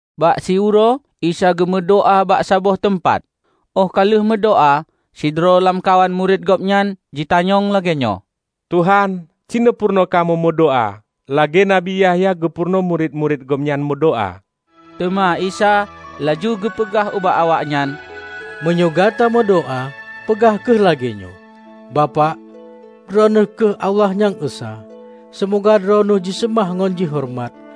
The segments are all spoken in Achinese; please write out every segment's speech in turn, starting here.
Bak siuroe Isa geumeudoá bak saboh teumpat. Óh ka lheueh meudoá, sidroe lamkawan murit gobnyan jitanyong lagée nyoe, "Tuhan, cineupeurunoe kamoe meudoá lagée Nabi Yahya geupeurunoe murit-murit gobnyan meudoá." Teuma Isa laju geupeugah ubak awaknyan, "Meunyoe gata meudoá, peugah kheueh lagée nyoe, 'Bapak, Droeneueh kheueh Allah Nyang Esa. Seumoga Droeneueh jiseumah ngon jihoreumat.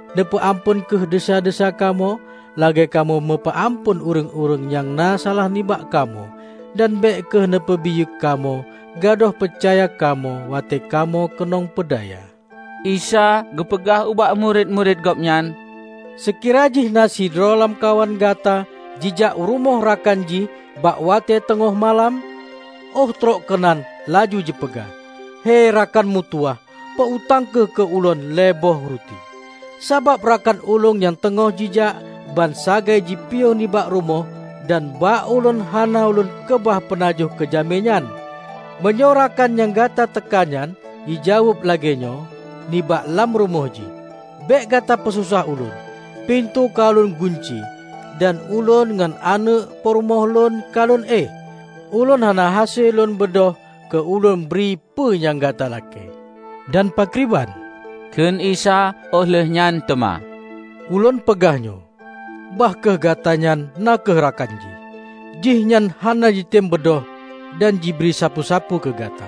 Neupeu amphon kheueh desya-desya kamoe, lagée kamoe meupeu amphon ureuëng-ureuëng nyang na salah nibak kamoe. Dan bék kheueh neupeubiyeu kamoe gadôh peucaya kamoe watée kamoe keunong peudaya.' " Isa geupeugah ubak murit-murit Gobnyan, "Seukira jih na sidroe lamkawan gata jijak u rumoh rakan jih bak watée teungoh malam, óh troh keunan laju jipeugah, 'Hei rakan mutuwah, peu-utang kheueh keu ulôn lhée boh ruti, sabab rakan ulôn nyang teungoh jijak, ban sagai jipiôh nibak rumoh dan bak ulôn hana lôn keubah peunajoh keu jamé nyan!' Meunyoe rakan nyang gata teuka nyan jijaweueb lagée nyoe, nibak lam rumoh jih, 'Bék gata peusosah ulôn! Pintoe ka ulôn gunci dan ulôn ngon aneuëk peurumoh lôn ka lôn éh. Ulôn hana hase lôn beudôh keu ulôn bri peue nyang gata lakée.' " "Dan pakriban?" kheun Isa óh lheueh nyan teuma. "Ulôn peugah, nyoe! Bah kheueh gatanyan na kheueh rakan jih, jihnyan hana jitem beudôh dan jibri sapeue-sapeue keu gata.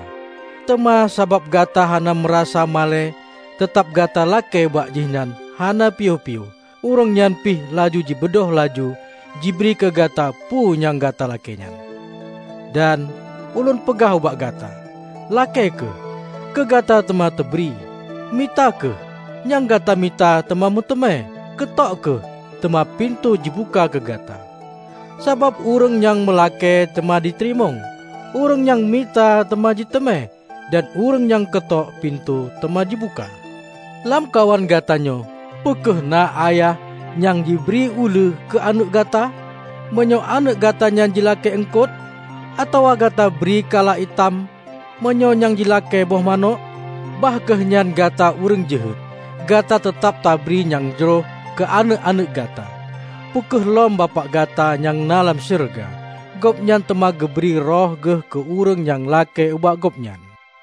Teuma sabab gata hana meurasa malée teutab gata lakée bak jihnyan hana piôh-piôh, ureuëng nyan pih laju jibeudôh laju jibri keu gata peue nyang gata lakée nyan. Dan, Ulôn peugah ubak gata: Lakée kheueh, keu gata teuma teubri; mita kheueh, nyang gata mita teuma meuteumé; keutok kheueh, teuma pintoe jibuka keu gata. Sabab ureuëng nyang meulakée teuma jiteurimong; ureuëng nyang mita teuma jiteumé, dan ureuëng nyang keutok, pintoe teuma jibuka. Lamkawan gata nyoe peu kheueh na ayah nyang jibri uleue keu aneuëk gata, meunyoe aneuëk gata nyan jilakée eungkot? Atawa gata bri kala itam, meunyoe nyang jilakée boh manök? Bah kheueh nyan gata ureuëng jeuhet, gata teutab tabri nyang jroh keu aneuëk-aneuëk gata. Peu kheueh lom Bapak gata nyang na lam syeuruga! Gobnyan teuma geubri Roh geuh keu ureuëng nyang lakée ubak Gobnyan!"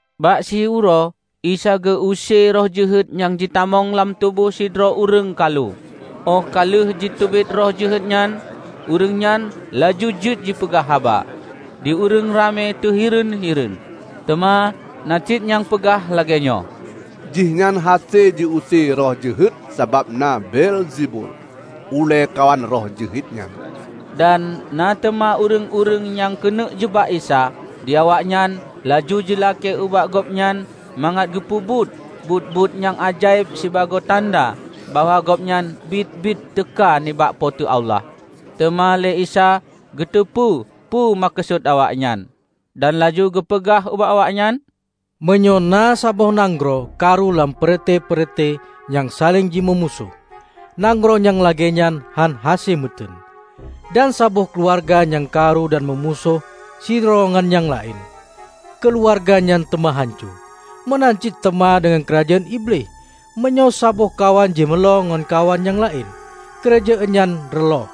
Bak siuroe Isa geu-use roh jeuhet nyang jitamong lam tuboh sidroe ureuëng kalu. Óh ka lheueh jiteubiet roh jeuhet nyan, ureuëng nyan laju jeuet jipeugah haba. Di ureuëng ramé teuhireuen-hireuen, teuma na cit nyang peugah lagée nyoe, "Jihnyan hase jiuse roh jeuhet sabab na Beelzebul, ulée kawan roh jeuhet nyan." Dan na teuma ureuëng-ureuëng nyang keuneuk jeubak Isa, di awaknyan laju jilakée ubak Gobnyan mangat geupeubuet buet-buet nyang ajaéb sibagoe tanda bahwa gobnyan biet-biet teuka nibak Po teu Allah. Teuma lé Isa geuteupeue peue meukeusut awaknyan. Dan laju geupeugah ubak awaknyan, "Meunyoe na saboh nanggroe karu lam peureute-peureute nyang saléng jimeumusoh, nanggroe nyang lagée nyan hán hase meuteuen. Dan saboh keuluwarga nyang karu dan meumusoh sidroe ngon nyang laén, keuluwarga nyan teuma hanco. Meunan cit teuma deungon keurajeuen Iblih; meunyoe saboh kawan jimeulo ngon kawan nyang laén, keurajeuen nyan reuloh.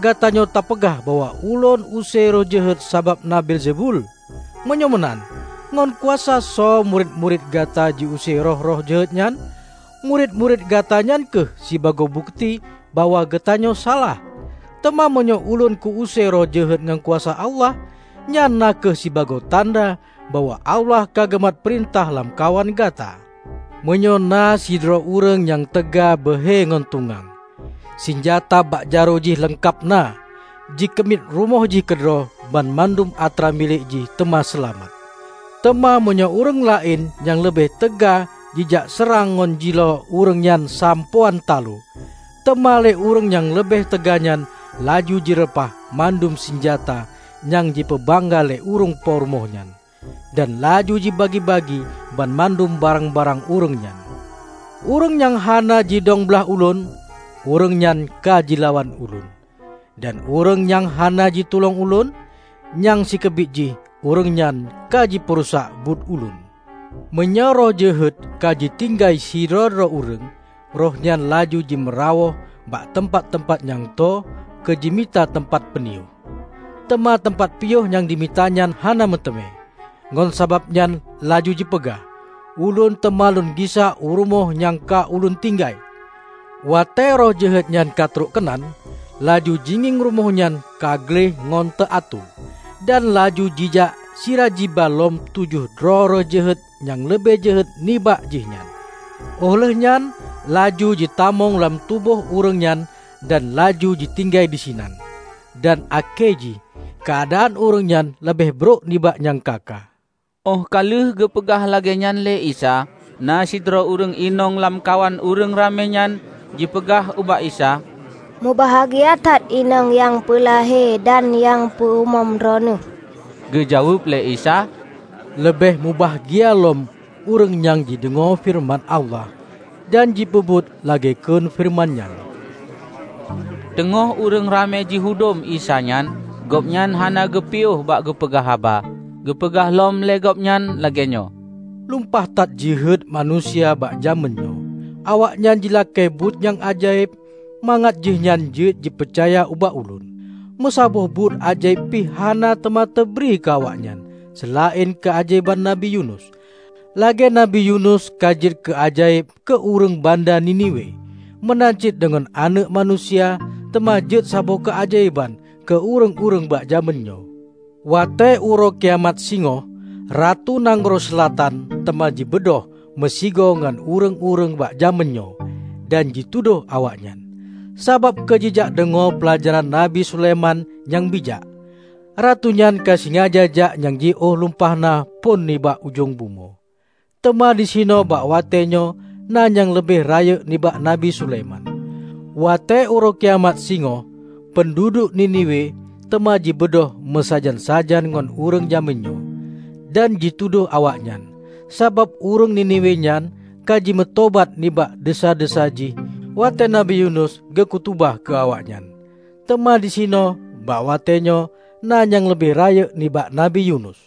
Gatanyoe tapeugah bahwa Ulôn use roh jeuhet sabab na Beelzebul. Meunyoe meunan, ngon kuasa soe murit-murit gata jiuse roh-roh jeuhet nyan? Murit-murit gata nyan kheueh sibagoe bukeuti bahwa gatanyoe salah! Teuma meunyoe ulôn ku-use roh jeuhet ngon kuasa Allah, nyan na kheueh sibagoe tanda bahwa Allah ka geumat peurintah lamkawan gata. Meunyoe na sidroe ureuëng nyang teuga beuhe ngon tungang, sinjata bak jaroe jih leungkab na, jikeumiet rumoh jih keudroe, banmandum atra milék jih teuma seulamat. Teuma meunyoe ureuëng laén nyang leubeh teuga jijak seurang ngon jilo ureuëng nyan sampoe án taloe, teuma lé ureuëng nyang leubeh teuganyan laju jireupah mandum sinjata nyang jipeubangga lé ureuëng po rumoh nyan, dan laju jibagi-bagi banmandum barang-barang ureuëng nyan. Ureuëng nyang hana jidong blaih Ulôn, ureuëng nyan ka jilawan Ulôn, dan ureuëng nyang hana jitulông Ulôn, nyang sikeubiet jih ureuëng nyan ka jipeurusak buet Ulôn!" "Meunyoe roh jeuhet ka jitinggai sidroe-droe ureuëng, rohnyan laju jimeurawôh bak teumpat-teumpat nyang tho keu jimita teumpat peuniôh, teuma teumpat piôh nyang jimita nyan hana meuteumé. Ngon sabab nyan laju jipeugah, 'Ulôn teuma lôn gisa u rumoh nyang ka ulôn tinggai!' Watée roh jeuhet nyan ka trok keunan, laju jingieng rumoh nyan ka gleh ngon teuatoe. Dan laju jijak sira jiba lom tujoh droe roh jeuhet nyang leubeh jeuhet nibak jihnyan. Óh lheuehnyan laju jitamong lam tuboh ureuëng nyan dan laju jitinggai disinan. Dan akhé jih keuadaan ureuëng nyan leubeh brok nibak nyang ka-ka." Óh ka lheueh geupeugah lagée nyan lé Isa, na sidroe ureuëng inong lamkawan ureuëng ramé nyan jipeugah ubak Isa, "Mubahgia that inong nyang peulahé dan nyang peumom Droeneueh!" Geujaweueb lé Isa, "Leubeh mubahgia lom ureuëng nyang jideungoe feureuman Allah dan jipeubuet lagée kheun feureuman nyan!" Teungoh ureuëng ramé jihudom Isa nyan, Gobnyan hana geupiôh bak geupeugah haba, geupeugah lom lé gobnyan lagée nyoe, "Lumpah that jeuhet manusia bak jamén nyoe. Awaknyan jilakée buet nyang ajaéb mangat jihnyan jeuet jipeucaya ubak Ulôn, meusaboh buet ajaéb pih hana teuma teubri keu awaknyan, seulaén keuajaéban Nabi Yunus. Lagée Nabi Yanus ka jeuet keuajaéb keu ureuëng banda Niniwe, meunan cit deungon Aneuëk Manusia teuma jeuet saboh keuajaéban keu ureuëng-ureuëng bak jamén nyoe. Watée uroe kiamat singoh, Ratu nanggroe Seulatan teuma jibeudôh meusigoe ngon ureuëng-ureuëng bak jamén nyoe, dan jitudôh awaknyan. Sabab keujijak deungoe peulajaran Nabi Sulaiman nyang bijak, Ratu nyan ka jisaja jak nyang jiôh lumpah na phon nibak ujong bumoe. Teuma disinoe bak watée nyoe na nyang leubeh rayeuk nibak Nabi Sulaiman! Watée uroe kiamat singoh, peunduduek Niniwe teuma jibeudôh meusajan-sajan ngon ureuëng jamén nyoe, dan jitudôh awaknyan, sabab ureuëng Niniwe nyan ka jimeutobat nibak desya-desya jih watée Nabi Yunus geukhutubah keu awaknyan. Teuma disinoe bak watée nyoe na nyang leubeh rayeuk nibak Nabi Yunus!"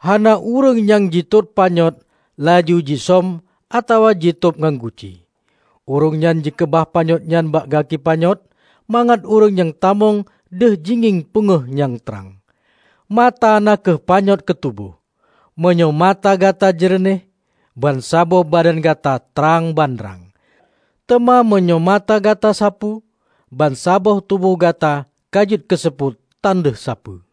"Hana ureuëng nyang jitot panyöt laju jisöm atawa jitôb ngon guci. Ureuëng nyan jikeubah panyöt nyan bak gaki panyöt, mangat ureuëng nyang tamong deuh jingieng peungéh nyang trang. Mata na kheueh panyöt keu tuboh. Meunyoe mata gata jeureunéh, bansaboh badan gata trang bandrang. Teuma meunyoe mata gata sapu, bansaboh tuboh gata ka jeuet keuseupôt tan deuh sapeue.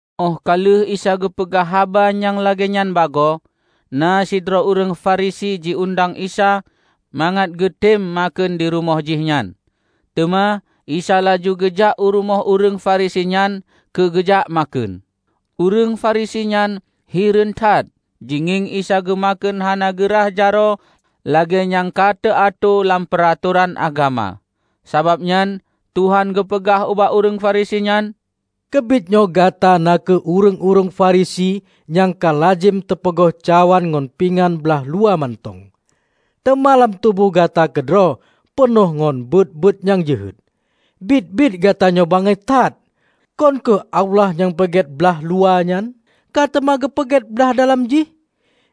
Óh ka lheueh Isa geupeugah haba nyang lagée nyan bagoe, na sidroe ureuëng Farisi ji-undang Isa mangat geutem makheun di rumoh jihnyan. Teuma Isa laju geujak u rumoh ureuëng Farisi nyan keu geujak makheun. Ureuëng Farisi nyan hireuen that jingieng Isa geumakheun hana geu rah jaroe lagée nyang ka teuatoe lam peuratoran agama. Sabab nyan Tuhan geupeugah ubak ureuëng Farisi nyan, "Keubiet nyoe gata na kheueh ureuëng-ureuëng Firisi nyang ka lazem tapeugleh cawan ngon pingan blah luwa mantong, teuma lam tuboh gata keudroe peunoh ngon buet-buet nyang jeuhet. Biet-biet gatanyoe bangai that! Kon kheueh Allah nyang peugét blah luwa nyan, ka teuma geupeugét blah dalam jih?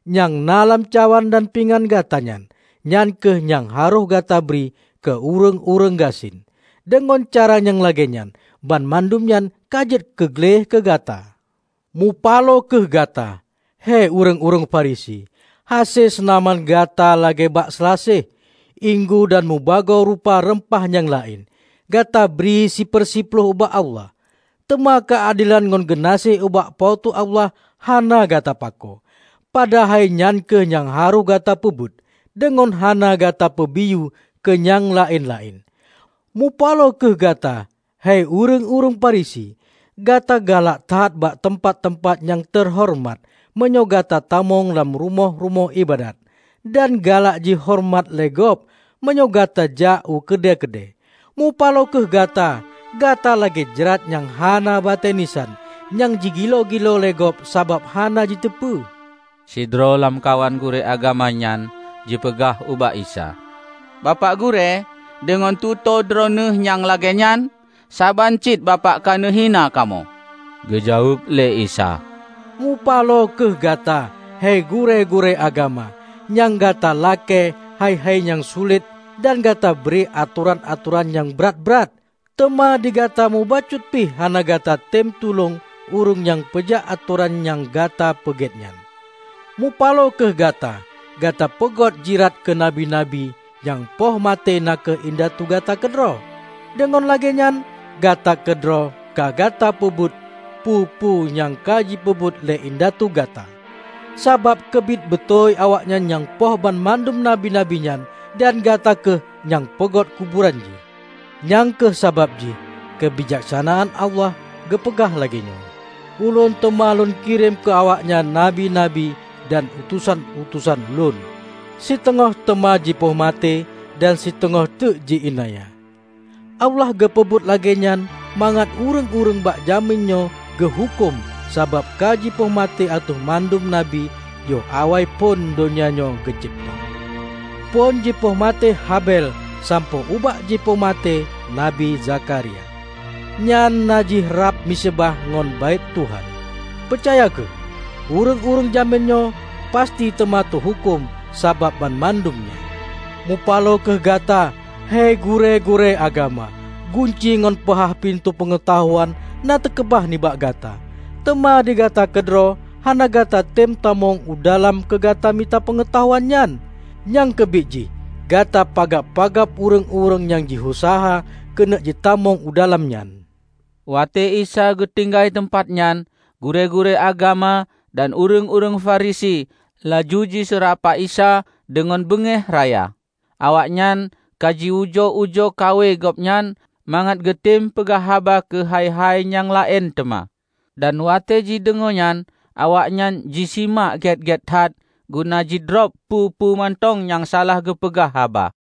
Nyang na lam cawan dan pingan gatanyan, nyan kheueh nyang harôh gata bri keu ureuëng-ureuëng gasien. Deungon cara nyang lagée nyan, banmandum nyan ka jeuet keu gleh keu gata. Mupaloe kheueh gata, hei ureuëng-ureuëng Farisi! Hase seunaman gata lagée bak seulaseh, inggu dan mubagoe rupa reumpah nyang laén, gata bri siper siploh ubak Allah, teuma keuadelan ngon geunaséh ubak Po teu Allah hana gata pakoe. Padahai nyan kheueh nyang harôh gata peubuet, deungon hana gata peubiyeu keu nyang laén-laén. Mupaloe kheueh gata, hei ureuëng-ureuëng Farisi! Gata galak that bak teumpat-teumpat nyang teuhoreumat meunyoe gata tamong lam rumoh-rumoh iébadat, dan galak jihoreumat lé gob meunyoe gata jak u keude-keude. Mupaloe kheueh gata, gata lagée jrat nyang hana batée nisan, nyang jigiloe-giloe lé gob sabab hana jiteupeue." Sidroe lamkawan gurée agama nyan jipeugah ubak Isa, "Bapak Gurée, deungon tutoe Droeneueh nyang lagée nyan, saban cit Bapak ka neuhina kamoe!" Geujaweueb lé Isa, "Mupaloe kheueh gata, hei gurée-gurée agama! Nyang gata lakée hai-hai nyang sulet dan gata bri atoran-atoran nyang brat-brat, teuma di gata mubacut pih hana gatatem tulông ureuëng nyang peujak atoran nyang gata peugét nyan. Mupaloe kheueh gata! Gata peugôt jirat keu Nabi-nabi, nyang poh maté na kheueh indatu gata keudroe. Deungon lagée nyan, gata keudroe ka gata peubeutôi peue-peue nyang ka jipeubuet lé indatu gata; sabab keubiet beutôi awaknyan nyang poh banmandum nabi-nabi nyan dan gata kheueh nyang peugôt kuburan jih. Nyang kheueh sabab jih Keubijaksanaan Allah geupeugah lagée nyoe, 'Ulôn teuma Lôn kirém keu awaknyan Nabi-nabi dan utosan-utosan lôn; siteungoh teuma jipoh maté dan siteungoh teuk ji iénanya!' Allah geupeubuet lagée nyan mangat ureuëng-ureuëng bak jamén nyoe geuhuköm sabab kajipoh maté ateueh mandum Nabi yoh awaiphon donya nyoe geucebta, phon jipoh maté Habel sampoe ubak jipoh maté Nabi Zakharia, nyan na jih rab miseubah ngon Baét Tuhan. Peucaya kheueh: Ureuëng-ureuëng jamén nyoe pasti teuma teuhuköm sabab banmandum nyan. Mupaloe kheueh gata, hei gurée-gurée agama! Gunci ngon peuhah pintoe peungeutahuan na teukeubah nibak gata, teuma digata keudroe hana gatatem tamong u dalam keu gata mita peungeutahuan nyan. Nyang keubiet jih gata pagab-pagab ureuëng-ureuëng nyang jiuseuha keuneuk jitamong u dalam nyan!" Watée Isa geutinggai teumpat nyan, gurée-gurée agama dan ureuëng-ureuëng Farisi laju jiseurapa Isa deungon beungéh raya. Awaknyan ka jiujoe-ujoe kawe gobnyan mangat geutem peugah haba keuhai-hai nyang laén teuma. Dan watée jideungoe nyan awaknyan jisimak gét-gét that guna jidrob peue-peue mantong nyang salah geupeugah haba.